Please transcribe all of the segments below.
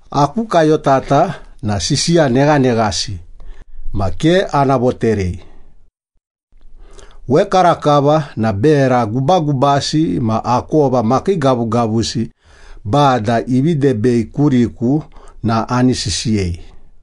Aku kayotata na sisiya neghaneghasi ma ke ana voterei. Wekarakava na bera gubagubasi ma akova makiigavugavusi Bada ivi debei kuriku na ani sisiyei.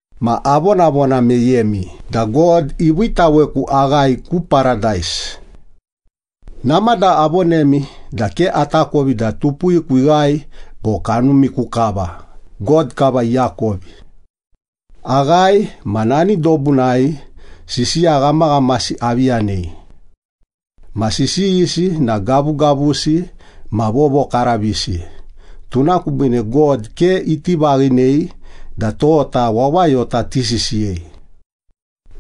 Ma avonavona meyemi da God iviitaweku aghae ku Paradais. Namada avonemi da ke atakovi da tupuwiku ighae bo kanumiku kava, God kava iakovi. Aghae, ma nani dobunai sisiya ghamaghamasi avi yanei. Ma sisiyisi na gavugavusi ma vovokaravisi, tuna kubiine God ke iti vaghinei da tota wawayota tisisiyei.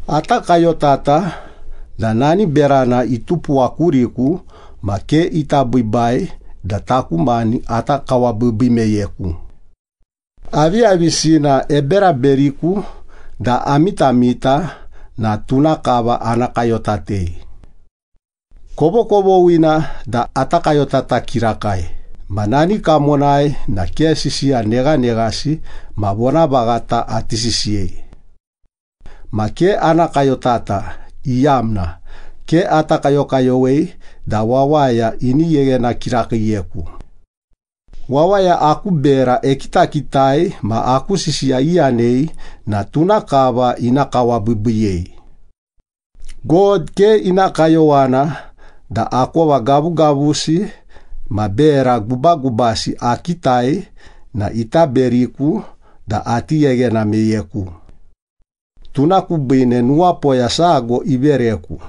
Ata kayotata da nani berana itupuwa kuriku ma ke ita biibai da taku mani ata kawabiibii meyeku. Aviyavisina eberaberiku da amitamita na tuna kava ana kayotatei. Kovokovoghina da ata kayotata kirakai ma nani kamonai na ke sisiya neghaneghasi ma vonavaghata ati sisiyei. Ma ke ana kayotata, iyamna ke ata kayokayowei da wawaya ini gheghena kirakiiyeku. Wawaya aku bera ekitakitai ma aku sisiya iyanei na tuna kava ina kawabiibiiyei. God ke ina kayowana da akova gavugavusi ma bera gubagubasi akitai na ita beriku da ati gheghena meyeku. Tuna kubiine nuwapoya sago ivereku,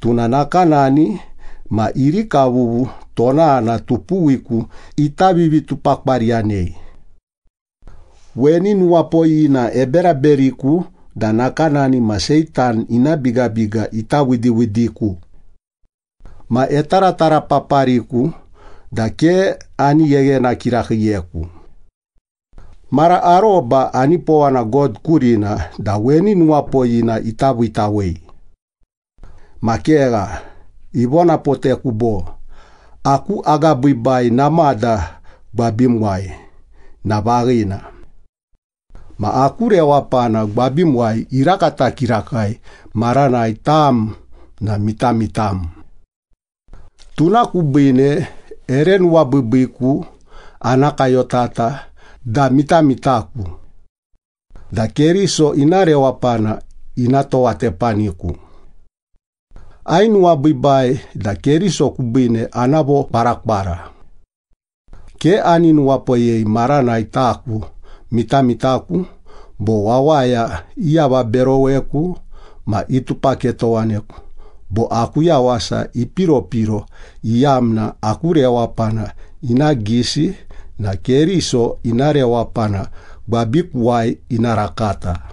tuna nakanani ma irikavuvu tonana tupuwiku ita vivitupakwariyanei. Weni nuwapoyina eberaberiku da nakanani ma Seitan ina bigabiga ita widiwidiku. Ma etaratarapapariku da ke ani gheghena kirakiiyeku. Mara aroba anipowana God kurina da weni nuwapoyina ita viitawei. Ma kegha, ivonapoteku bo, “Aku agabiibai namada gwabimuwai na vaghina. Ma aku rewapana gwabimuwai irakata kirakai maranai tam na mitamitam.” Tuna kubiine ere nuwabiibiiku ana kayotata da mitamitaku, da Keriso ina rewapana ina towatepaniku. Ainuwabiibai da Keriso kubiine ana vokwarakwara. Ke ani nuwapoyei maranai taku mitamitaku, bo wawaya iavaberoweku ma itupaketowaneku, bo aku yawasa ipiropiro, iyamna aku rewapana ina gisi na Keriso ina rewapana gwabikuwai ina rakata.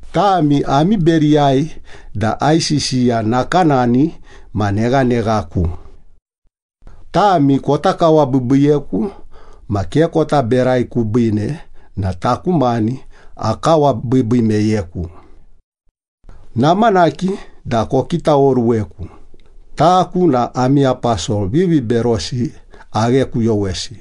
Tami ami beriyai da aisisiya nakanani ma neghaneghaku. Tami kota kawabiibiiyeku ma ke kota berai kubiine na taku mani akawabiibii meyeku. Namanaki da kokitaoruweku, taku na ami aposol viviberosi aghekuyowesi.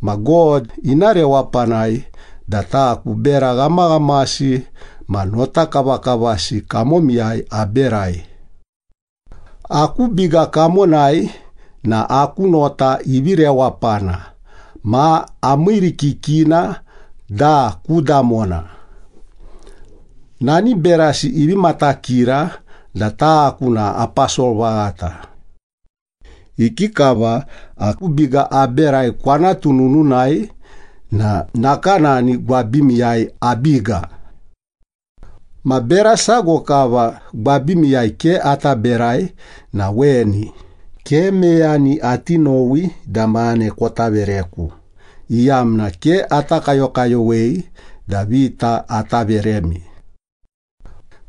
Ma God ina rewapanai da taku bera ghamaghamasi ma notakavakavasi kamomiyai aberai. Aku biga kamonai na aku nota ivi rewapana ma amiirikikina da ku damona. Nani berasi ivi matakira da taku na aposol vaghata. Ikikava aku biga aberai kwanatu nununai na nakanani gwabimiyai abiga. Ma bera sago kava gwabimiyai ke ata berai na weni, ke meyani ati nowi da mane kota vereku, iyamna ke ata kayokayowei da vita ata veremi.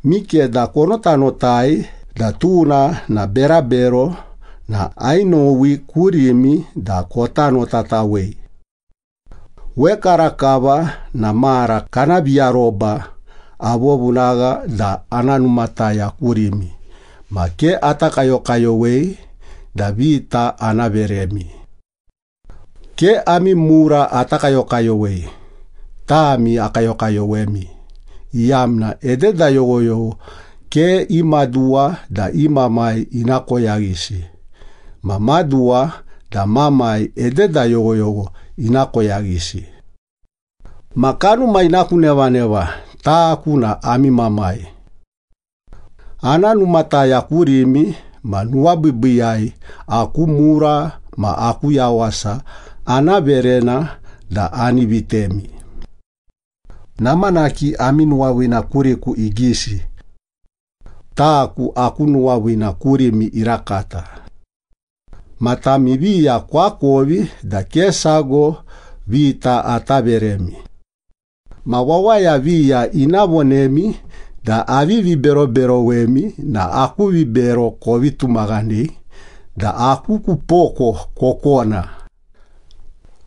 Mikeda konotanotai da tuna na berabero na ainowi kurimi da kota notatawei. Wekarakava na mara kana viaroba avovunagha da ana numataya kurimi ma ke ata kayokayowei da vita ana veremi. Ke ami mura ata kayokayowei, tami akayokayowemi, iyamna ededa yoghoyogho ke i maduwa da i mamai ina koyaghisi ma maduwa da mamai ededa yoghoyogho ina koyaghisi. Ma kanuma ina ku nevaneva taku na ami mamai. Ana numataya kurimi ma nuwabiibiiyai aku mura ma aku yawasa ana verena da ani vitemi. Namanaki ami nuwaviina kuriku igisi. Taku aku nuwaviina kurimi irakata. Ma tami viya koakovi da ke sago vita ata veremi. Ma wawaya viya ina vonemi da avivi beroberowemi na aku vibero kovi tumaghanei da aku ku poko kokona.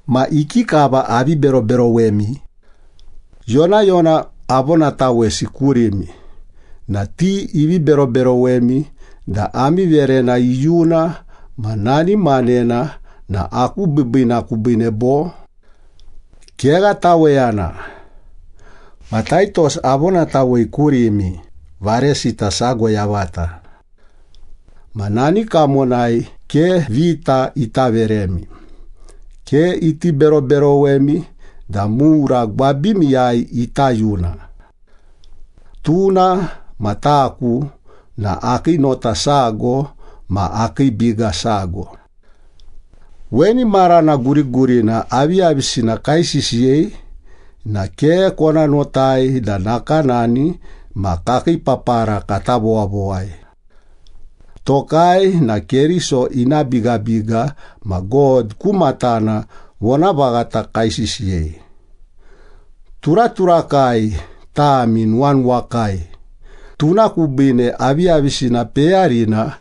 Ma ikikava avi beroberowemi? Yonayona avonatawesi kurimi na ti ivi beroberowemi da ami verena iyuna ma nani manena na aku biibiina kubiine bo? Kegha taweyana. Ma Taitos avonatawei kurimi, varesita sago yavata. Ma nani kamonai ke vita ita veremi, ke iti beroberowemi da mura gwabimiyai ita yuna. Tuna ma taku na akii nota sago ma akii biga sago. Weni marana gurigurina aviyavisina kaisisiyei na ke kona notai da nakanani ma kakii papara kata vowavowai. Tokai na Keriso ina bigabiga ma God ku matana vonavaghata kaisisiyei. Turaturakai, tami nuwanuwakai, tuna kubiine aviyavisina peyarina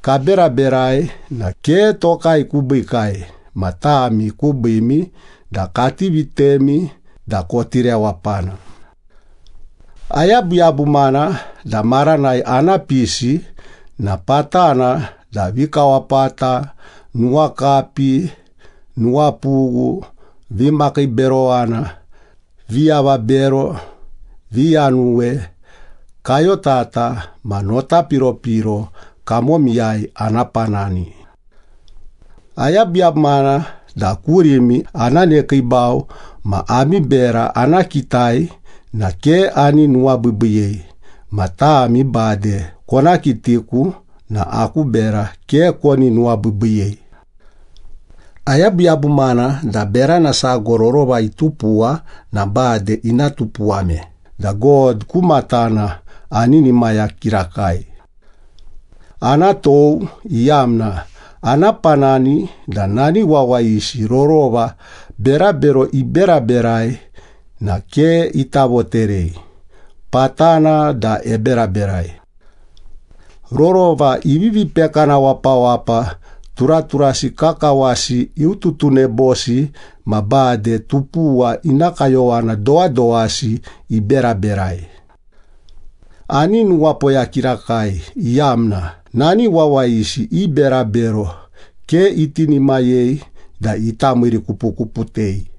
kaberaberai na ke tokai kubiikai ma tami kubiimi da kati vitemi da koti rewapana. Ayabuyabumana da maranai ana pisi na patana da vikawapata, nuwakapi, nuwapughu, vimakiiberowana, viavabero, viyanuwe, kayotata ma nota piropiro kamomiyai ana panani. Ayabuyabumana da kurimi ana nekiibau ma ami bera ana kitai na ke ani nuwabiibiiyei ma tami bade kona kitiku na aku bera ke koni nuwabiibiiyei. Ayabuyabumana da berana sago rorova itupuwa na bade ina tupuwame da God ku matana aninimaya kirakai. Ana tou, iyamna ana panani da nani wawayisi rorova berabero iberaberai na ke ita voterei, patana da eberaberai. Rorova ivivi pekana wapawapa, turaturasi kakawasi iututunebosi ma bade tupuwa ina kayowana dowadowasi iberaberai. Ani nuwapoya kirakai iyamna nani wawayisi i berabero ke itinimayei da ita miirikupukuputei.